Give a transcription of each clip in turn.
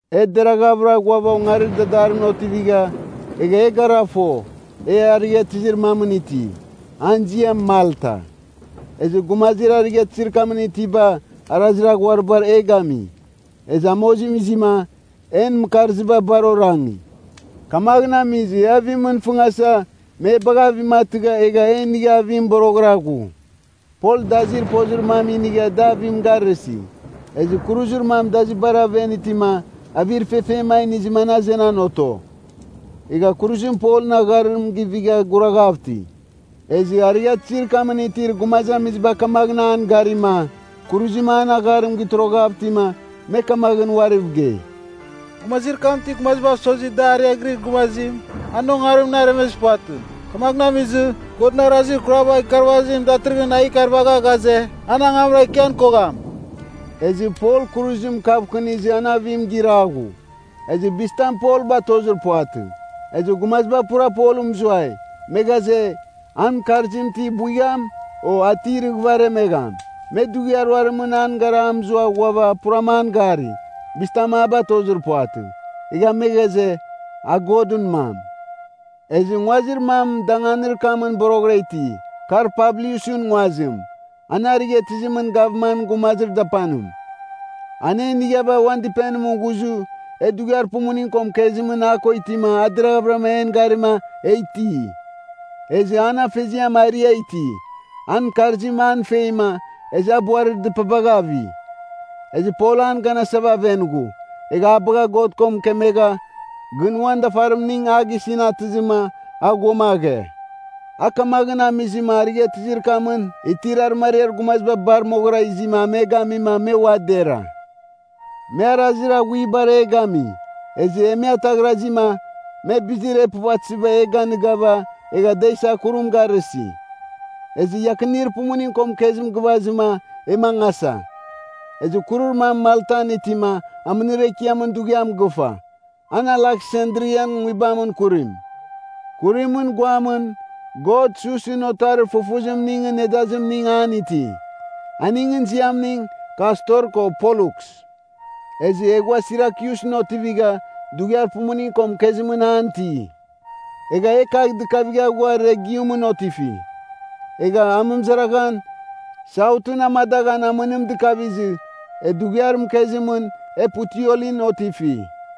E deraghavɨra ghuava ongarir dadarimɨn otivigha, egha e gara fo, e arighatɨzir mamɨn ti, an ziam Malta. Ezɨ gumazir arighatɨzir kamɨn itiba arazir aghuaribar e gami. Ezɨ amozim izima, en mɨkarziba bar orangi, kamaghɨn amizɨ e avimɨn fɨngasa, me e bagha avim atɨgha egha e inigha avim boroghɨra ghu. Pol dazir pozir mam inigha da avim garɨsi. Ezɨ kuruzir mam dazibar aven itima, avir fefem a inizɨma an azenan oto. Egha kuruzim Polɨn agharim givigha guraghav iti. Ezɨ arighatɨzir kamɨn itir gumazamiziba kamaghɨn an garima, kuruzim an agharim gitoroghav itima, me kamaghɨn uariv gei, “Gumazir kam ti gumazibav sozi da ariaghirir gumazim, an ongarimɨn aremezir puvatɨ. Kamaghɨn amizɨ, godɨn arazir kuraba ikarvazim datɨrɨghɨn a ikarvagha ghaze, an angamra ikian kogham.” Ezɨ Pol kuruzim kavkɨnizɨ an avim gira ghu. Ezɨ bizitam Pol batozir puvatɨ. Ezɨ gumaziba pura Polɨn mɨzuai, me ghaze, an mɨkarzim ti buigham, o a ti irɨghɨva aremegham. Me dughiar ruarimɨn an gara a mɨzua ghuava puram an gari, bizitam a batozir puvatɨ. Egha me ghaze, a godɨn mam. Ezɨ nguazir mam danganir kamɨn boroghɨra iti, kar Publiusɨn nguazim, an arighatɨzimɨn gavman gumazir dapanim. An e inighava uan dɨpenimɨn ghuzɨ e dughiar pumuning ko mɨkezimɨn a ko itima a deraghvɨra en garima e iti. Ezɨ an afeziam arɨa iti, an mɨkarzim an feima, ezɨ a buarir dɨpabagh avi. Ezɨ Pol an ganasava aven ghu, egha a bagha God ko mɨkemegha, gɨn uan dafarimning a gisɨn atɨzɨma, a ghuamaghe. A kamaghɨn amizɨma, arighatɨzir kamɨn itir arɨmariar gumaziba bar moghɨra izima a me gamima me ua dera. Me arazir aghuibar e gami, ezɨ e me ataghrazima, me bizir e puvatɨziba e ganɨgava egha da isa kurim garɨsi. Ezɨ iakinir pumuning ko mɨkezim gɨvazɨma e mangasa. Ezɨ kurir mam Maltan itima, amɨnir ekiamɨn dughiam gɨfa. An Aleksandrian nguibamɨn kurim. Kurimɨn guamɨn god Susɨn otarir fufuzimningɨn nedazimning an iti. Aningɨn ziamning Kastor ko Polluks. Ezɨ e ghua Sirakyusɨn otivigha, dughiar pumuning ko mɨkezimɨn an iti. Egha e kagh dɨkavigha ghua Regiumɨn otifi. Egha amɨmɨzaraghan, Sautɨn amadaghan amɨnim dɨkavizɨ, e dughiar mɨkezimɨn e Puteolin otifi.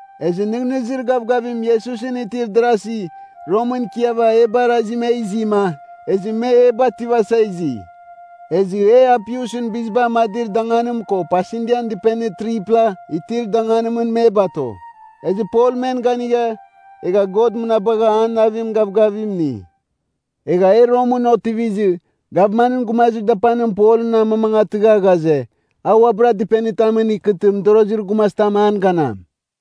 Ezɨ nɨghnɨzir gavgavim Iesusɨn itir darasi Romɨn ikiava e barazima e izima, ezɨ me e bativasa izi. Ezɨ e Apiusɨn biziba amadir danganim ko Pasindian Dɨpenir 3pla itir danganimɨn me bato. Ezɨ Pol men ganigha, egha God mɨnabagha an navim gavgavim ini. Egha e Romɨn otivizɨ, gavmanɨn gumazir dapanim Polɨn amamangatɨgha ghaze, a uabɨra dɨpenitamɨn ikɨtɨ mɨdorozir gumazitam an ganam.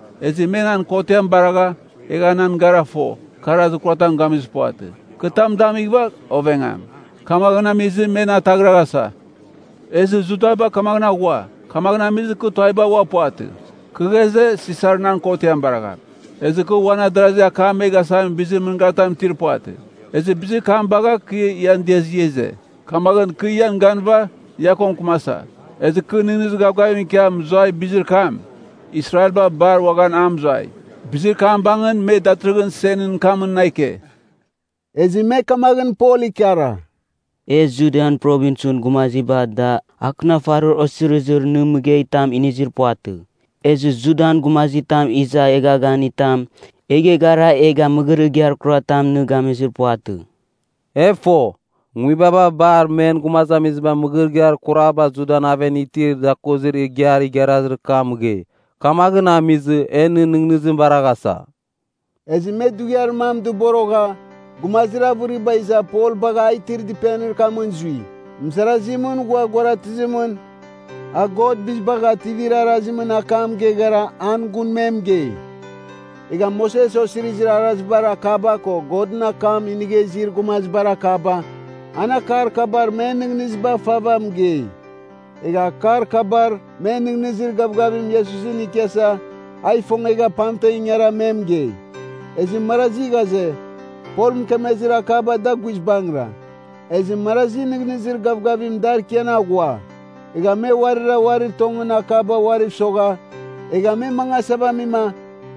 Ezɨ me nan kotiam baragha, egha nan gara fo, kɨ arazir kuratam gamizir puvatɨ. Kɨ tam damighɨva ovegham. Kamaghɨn amizɨ me na ataghraghasa. Ezɨ Judaba kamaghɨn aghua. Kamaghɨn amizɨ kɨ tuaviba ua puvatɨ. Kɨ ghaze, Sisar nan kotiam baragham. Ezɨ kɨ uan adarazi akam me gasamin bizir mɨngaritam itir puvatɨ. Ezɨ bizir kam bagha kɨ ian diazɨ ia ize. Kamaghɨn kɨ ian ganɨva ia ko mɨkɨmasa. Ezɨ kɨ nɨghnɨzir gavgavim ikia mɨzuai bizir kam, Israelba bar uaghan a mɨzuai. Bizir kam bangɨn me datɨrɨghɨn senɨn kamɨn na ike.” Ezɨ me kamaghɨn Pol ikara, “E Judian Provinsɨn gumaziba da akɨnafarir osirizir nɨ mɨgeitam inizir puvatɨ. Ezɨ Judan gumazitam iza eghaghanitam e geghara egha mɨgɨrɨgɨar kuratam nɨ gamizir puvatɨ. E fo, nguibaba bar men gumazamiziba mɨgɨrɨgɨar kurabar Judan aven itir dakozir igiar igharazir kam mɨgei. Kamaghɨn amizɨ, e nɨn nɨghnɨzim baraghasa.” Ezɨ me dughiar mam dɨborogha, gumazir avɨriba iza Pol bagha a itir dɨpenir kamɨn zui. Mɨzarazimɨn ghua guaratɨzimɨn, a God Bizibagh Ativir Arazimɨn akam geghara an gun me mɨgei. Egha Moses Osizirir Arazibar akaba ko Godɨn akam inigha izir gumazibar akaba, an akar kabar men nɨghnɨziba fava mɨgei. Egha akar kabar me nɨghnɨzir gavgavim Iesusɨn ikiasa a ifongegha pamtem ingara me mɨgei. Ezɨ marazi ghaze, Pol mɨkemezir akaba da guizbangɨra, ezɨ marazi nɨghnɨzir gavgavim dar ikian aghua. Egha me uarira uarir tongɨn akaba uariv sogha egha me mangasava amima,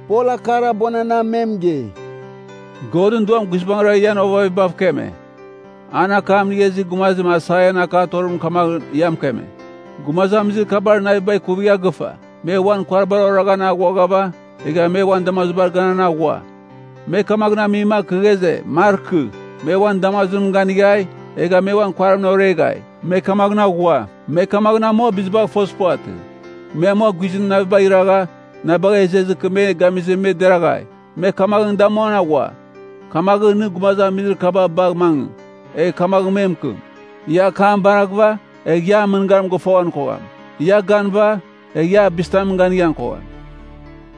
Pol akar abuananam me mɨgei, “Godɨn Duam guizbangɨra ian ovavibav keme. An akam inigha izir gumazim Aisaian akatorimɨn kamaghɨn ia mɨkeme, ‘Gumazamizir kabar naviba ikuvigha gɨfa. Me uan kuaribar oraghan aghuaghava, egha me uan damazibar ganan aghua. Me kamaghɨn amima, kɨ ghaze, markɨ. Me uan damazimɨn ganighai, egha me uan kuaribar oreghai. Me kamaghɨn aghua. Me kamaghɨn amua bizibagh fozir puvatɨ. Me amua guizɨn navibagh iragha na bagha izezɨ, kɨ me gamizɨ me deraghai. Me kamaghɨn damuan aghua. Kamaghɨn, nɨ gumazamizir kaba bagh mangɨ, egh kamaghɨn me mɨkɨm, Ia akam baraghɨva, egh ia an mɨngarim gɨfoghan kogham; ia ganɨva, egh ia bizitamɨn ganighan kogham.’”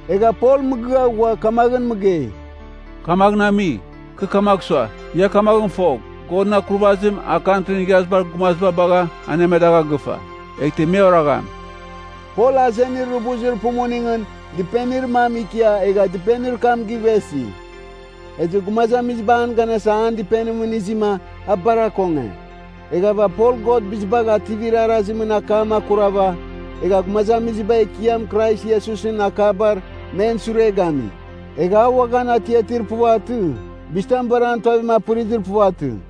Egha Pol mɨgɨa ghua, kamagh mɨgei, “Kamaghɨn ami, kɨ kamagh sua, ia kamaghɨn fogh, Godɨn akurvazim, a Kantrin Igharazibar Gumaziba bagha anemadagha gɨfa. Eghtɨ me oragham!” Pol azenir rubuzir pumuningɨn dɨpenir mam ikia egha dɨpenir kam givesi. Ezɨ gumazamiziba an ganasa an dɨpenimɨn izima a bar akonge. Eghava Pol God Bizibagh Ativir Arazimɨn akam akurava egha gumazamiziba Ekiam Krais Iesusɨn akabar men sure gami. Egha a uaghan atiatir puvatɨ, bizitam bar an tuavim apɨrizir puvatɨ.